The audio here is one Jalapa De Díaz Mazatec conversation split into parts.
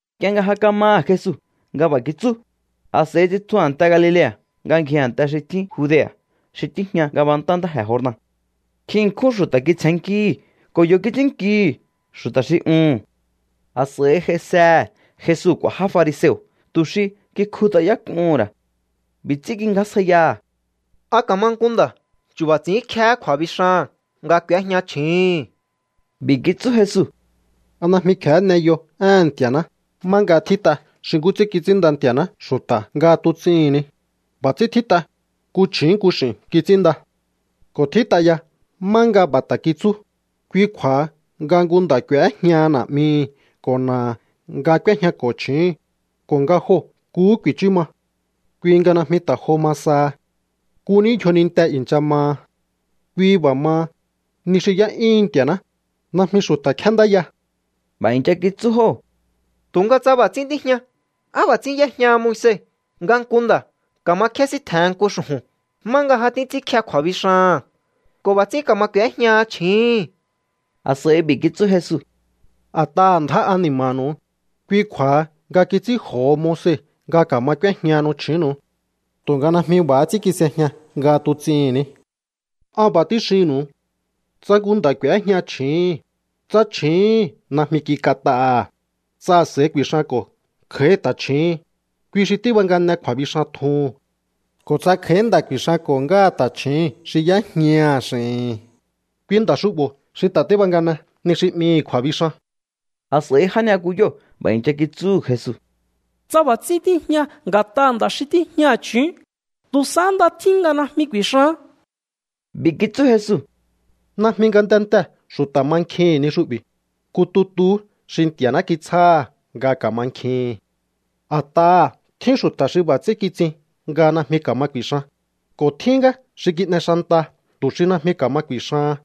Nk'ie nga ja kamaha̱ Jesu nga b'a̱ kitsú, a̱s'a̱i tsitju a̱nte Galilea̱ nga ngji a̱nte xi tjín Judea̱ xi tíjña ngabantá ntáje̱ Jordan. Nkjin ṉkjún xu̱ta̱ kitsjennkíhi̱ ko̱ yo̱ kits'ínnkihi̱ xu̱ta̱ xi uhu̱n. A̱s'a̱i j'aisehe̱ Jesu k'u̱a̱ já fariseo̱ tu̱ xi kikjut'ayák'uhu̱n ra̱. B'i̱ ts'ín kingjásjaiyaha̱: —¿A ka̱ma nku nda̱ chu̱ba̱ ts'i̱ínkjehé kju̱a̱bixaha̱n nga k'u̱éjña chju̱úhu̱n? B'i̱ kitsú Jesu: —¿A najmi kje̱hé n'eyo éhe̱n Nti̱a̱ná má nga tjít'a xi nkú ts'ín kits'ínnda Nti̱a̱ná xu̱ta̱ nga tuts'ihi̱n ni? B'a̱ ts'ín tjít'a: “Nku chju̱ún nku x'i̱n kits'ínnda.” Ko̱ tjít'a ya má nga b'a̱ ta̱ kitsú: “Kui kju̱a̱ha nga nku nda̱ k'u̱éjñaha na̱'mihi̱ ko̱ na̱aha̱ nga k'úéjñako̱ chju̱úhu̱n, ko̱ nga joo̱ nkuhú ku̱i̱chú ma.” Kui nga najmi ta̱ jo ma saha. Nku ní yjoninte i̱ncha maha. Kui b'a̱ maha, ni xi y'é'yúhun Nti̱a̱ná, najmi xu̱ta̱ kjéndáya. B'a̱ i̱ncha kitsú jóo̱: —Tu̱nga tsa b'a̱ ts'ín tíjña, ¿á b'a̱ ts'ín y'éjñaha Moise nga nku nda̱ ka̱ma kjésíntje̱hen nku xu̱ju̱n má nga ja títs'ínkje kju̱a̱bixaha̱n ko̱ b'a̱ ts'ín ka̱ma k'u̱éjñaha chju̱úhu̱n? A̱s'a̱i b'i̱ kitsú Jesu: —A̱t'aha̱ ndjá ani̱ma̱nu̱u, kui kju̱a̱ha nga kits'ínj'o̱ho Moise nga ka̱ma k'úéjñahanu chju̱únnu̱u. Tu̱nga najmi b'a̱há ts'ín kis'ejña nga tuts'ihi̱n ni. An b'a̱ tíxinnu̱u. Tsa nku nda̱ k'u̱éjña chju̱úhu̱n, tsa chju̱úhu̱n najmi kik'at'aha̱, tsa a̱s'a̱i ku̱i̱xanko̱ kj'a̱í ta̱chju̱ún, kui xi tíbangane kju̱a̱bixan tjuhu̱n. Ko̱ tsa kj'a̱í nda̱ ku̱i̱xanko̱ ngáha ta̱chju̱ún xi y'éjñaha̱ x'i̱hi̱n, kui nda̱ xu'bo̱ xi ta̱ tíbangane ni xi 'mihi̱ kju̱a̱bixan. A̱s'a̱i já ni'yakuyóo̱ b'a̱ i̱ncha kitsúhu̱ Jesu: —Tsa b'a̱ ts'ín tíjña nga̱t'aha̱ nda̱ xi tíjñaha̱ chju̱ún, tu̱ sahá nda tjín nga najmi ku̱i̱xaán. B'i̱ kitsú Jesu: —Najmi ngatentee̱ xu̱ta̱ mankjihi̱n ni xu'bi̱, nku tutuhú xi Nti̱a̱ná kitsjáha̱ nga ka̱mankjihi̱n. A̱t'aha̱ tjín xu̱ta̱ xi b'a̱ ts'ín kitsin nga najmi ka̱ma ku̱i̱xan, ko̱ tjín ngá xi kin'e xanta tu̱ xi najmi ka̱ma ku̱i̱xahan.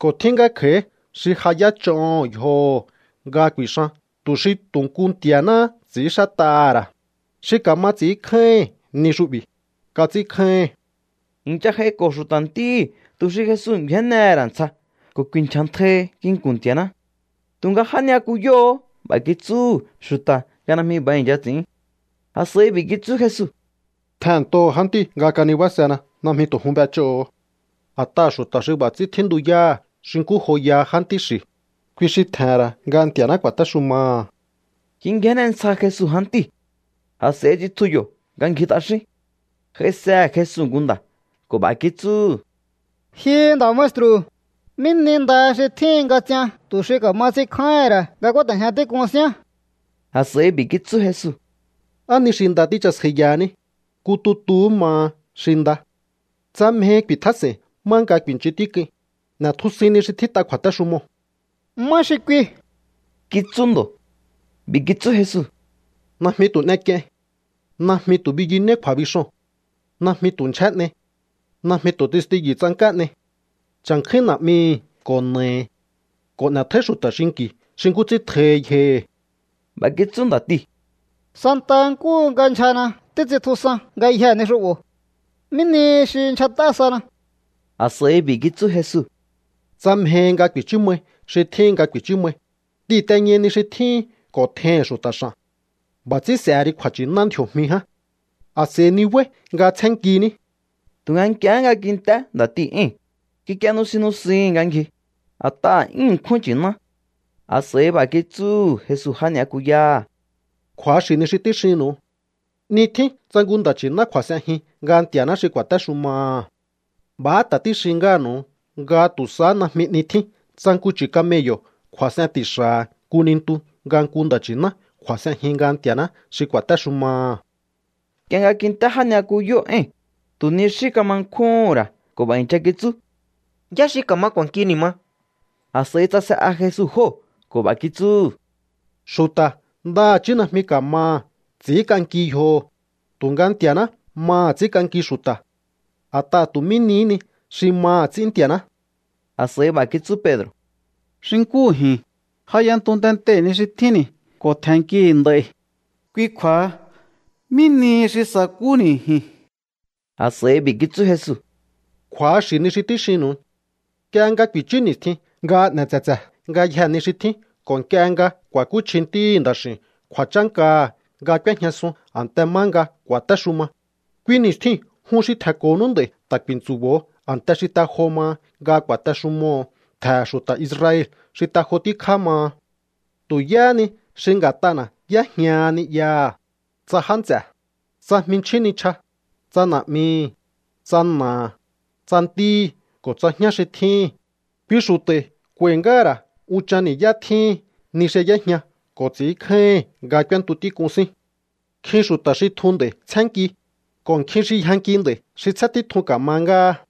Ko̱ tjín ngá kj'a̱í xi ja y'éch'oho̱ yjoho̱ nga ku̱i̱xan tu̱ xi tu̱ nku Nti̱a̱náhá ts'i̱ínxát'aha̱ ra̱. Xi ka̱ma ts'i̱ínkjáíhi̱n ni xu'bi̱, kats'ínkjáíhi̱n. I̱ncha j'aiko̱ xu̱ta̱ ntíhi̱ tu̱ xi Jesu ngju̱énnehe̱ ra̱ ntsja ko̱ ku̱i̱nchja̱ntjaihi nginku̱n Nti̱a̱ná. Tu̱nga já ni'yakuyóo̱hó b'a̱ kitsúhu̱ xu̱ta̱ nga najmi b'a̱ i̱ncha ts'i̱ín. A̱s'a̱i b'i̱ kitsú Jesu: —Tjehe̱nntoho̱ jántíu̱ nga kanibásena. Najmi tu̱ jun b'ech'óho̱o. A̱t'aha̱ xu̱ta̱ xi b'a̱ ts'ín tjíntuyáha̱ xi nkú joyaha jántí xi̱, kui xi tje̱he̱n ra̱ nga Nti̱a̱ná ku̱a̱téxumaha̱. Kingjénne ntsja Jesu jántíu̱. A̱s'a̱i tsitju yo̱ nga ngji t'axín. J'aisehe̱ Jesu nku nda̱ ko̱ b'a̱ kitsúhu̱: —Ji nda̱ maestru̱, ¿mí ni nda xi tjíhin nga ts'ian tu̱ xi ka̱ma ts'inkjáíhi̱n ra̱ nga kúáte̱jña tík'un síán? A̱s'a̱i b'i̱ kitsú Jesu: —¿Á ni xi nda tíchasjaiyahaní? Nku tutuhú maha xi nda. Tsa mjehi ku̱i̱tjás'e̱i̱n má nga ku̱i̱nchun tík'uin, n'e̱tjusuin ni xi tjít'a kju̱a̱téxumoo̱. —¿Má xi kui? —kitsú ndo̱. B'i̱ kitsú Jesu: —Najmi tu̱ n'ek'iein. Najmi tu̱ biyunéí kju̱a̱bixoo̱n. Najmi tu̱ ndyjé n'ei. Najmi tu̱ testiyu̱ tsank'á n'ei. Cha̱nkjúín na̱'mihi̱ ko̱ na̱ahi̱. Ko̱ n'e̱tjóí xu̱ta̱ xinki̱ xi nkú ts'ín tjohi yjohi̱. B'a̱ kitsú nda̱tiu̱: —Santa nkúhu nga ndyjana títs'intjusan ngayjee̱ ni xu'bo̱. ¿Mí nihi xi ndyjat'á sana? A̱s'a̱i b'i̱ kitsú Jesu: —Tsa mjehi nga ku̱i̱chú mai xi tjíhin nga ku̱i̱chú mai, t'ihi̱nteñai ni xi tjíhin ko̱ tjeihi̱n xu̱ta̱ x'a̱n. B'a̱ ts'ín s'e̱he ri kju̱a̱nchi̱ná ndji̱o̱jmi ján. A̱s'a̱i nibáí nga tsjénnkiní. Tu̱nga nk'iehé nga kint'é nda̱tiu̱ éi̱n, kik'ie nusin nusihi̱n nga ngji, a̱t'aha̱ 'yún ṉkjún nchi̱ná. A̱s'a̱i b'a̱ kitsúhu̱ Jesu já ni'yaku'yáha̱: —Kju̱axi̱ ni xi tíxinnu̱u. 'Ni tjín tsa nku nda̱ nchi̱ná kju̱a̱s'enjin nga Nti̱a̱ná xi ku̱a̱téxumaha̱. B'a̱há ta̱ tíxin ngáha̱nu̱u nga tu̱ sahá najmi 'ni tjín tsa nku chu̱ camello̱ kju̱a̱s'en ti̱xa̱ha̱ nku nintu nga nku nda̱ nchi̱ná kju̱a̱s'enjin nga Nti̱a̱ná xi ku̱a̱téxumaha̱. Nk'ie nga kint'é já ni'yakuyóo̱ éi̱n, tu̱ ni xí kama nkjúhún ra̱ ko̱ b'a̱ i̱ncha kitsú: —¿Yá xi ka̱ma k'u̱a̱nki ni̱ ma? A̱s'a̱i tsase'a Jesu jóo̱ ko̱ b'a̱ kitsúhu̱: —Xu̱ta̱ ndaha̱chí najmi ka̱maha̱ ts'i̱ínk'anki yjoho̱, tu̱nga Nti̱a̱ná maha̱ ts'ínk'anki xu̱ta̱. A̱t'aha̱ tu̱ mí nihí ni xi maha̱ ts'ín Nti̱a̱ná. A̱s'a̱i b'a̱ kitsú Pedro̱: —Xi nkúhu ji̱n, ja y'entu tentei̱ ni xi tjínni̱ ko̱ tje̱nnkihi̱ nd'a̱i̱. Kui kju̱a̱ha, ¿mí nihi xi sa̱kúhúni̱ ji̱n? A̱s'a̱i b'i̱ kitsú Jesu: —Kju̱axi̱ ni xi tíxinnu̱u. Nk'ie nga ku̱i̱chú ni̱stjin nga n'e̱ tse̱tse̱ ngayjee̱ ni xi tjín ko̱ nk'ie nga ku̱a̱kúchji Ntíhi̱ Nda̱x'i̱u̱n kju̱a̱chánkaha̱ nga k'úéjñasun a̱nte má nga ku̱a̱téxuma, kui ni̱stjiu̱n jun xi tje̱nko̱nú nd'a̱i̱ ta̱ ku̱i̱ntsu̱bo̱o a̱nte xi te jo maha nga ku̱a̱texumoho̱o ntje̱he̱ xu̱ta̱ Israel xi te jo tíkjá maha. Tu̱ yáhá ni xi nga̱t'ana̱ y'éjñaha ni'yaha̱, tsa já nts'e̱, tsa jminchjín nichja, tsa na̱'mihi̱, tsa na̱aha̱, tsa ntíhi̱ ko̱ tsa jñá xi tjíhi̱n, kui xu̱ta̱i̱ k'u̱a̱i̱ ngáha̱ ra̱ unchan ni̱yá tjíhin ni xi y'éjña ko̱ ts'i̱ínkjáíhi̱n nga k'úéntu tík'un sín. Nkjin xu̱ta̱ xi tjun nd'a̱i̱ tsjénnki, ko̱ nkjin xi yjanki nd'a̱i̱ xi tsjén títjun ka̱ma ngáha.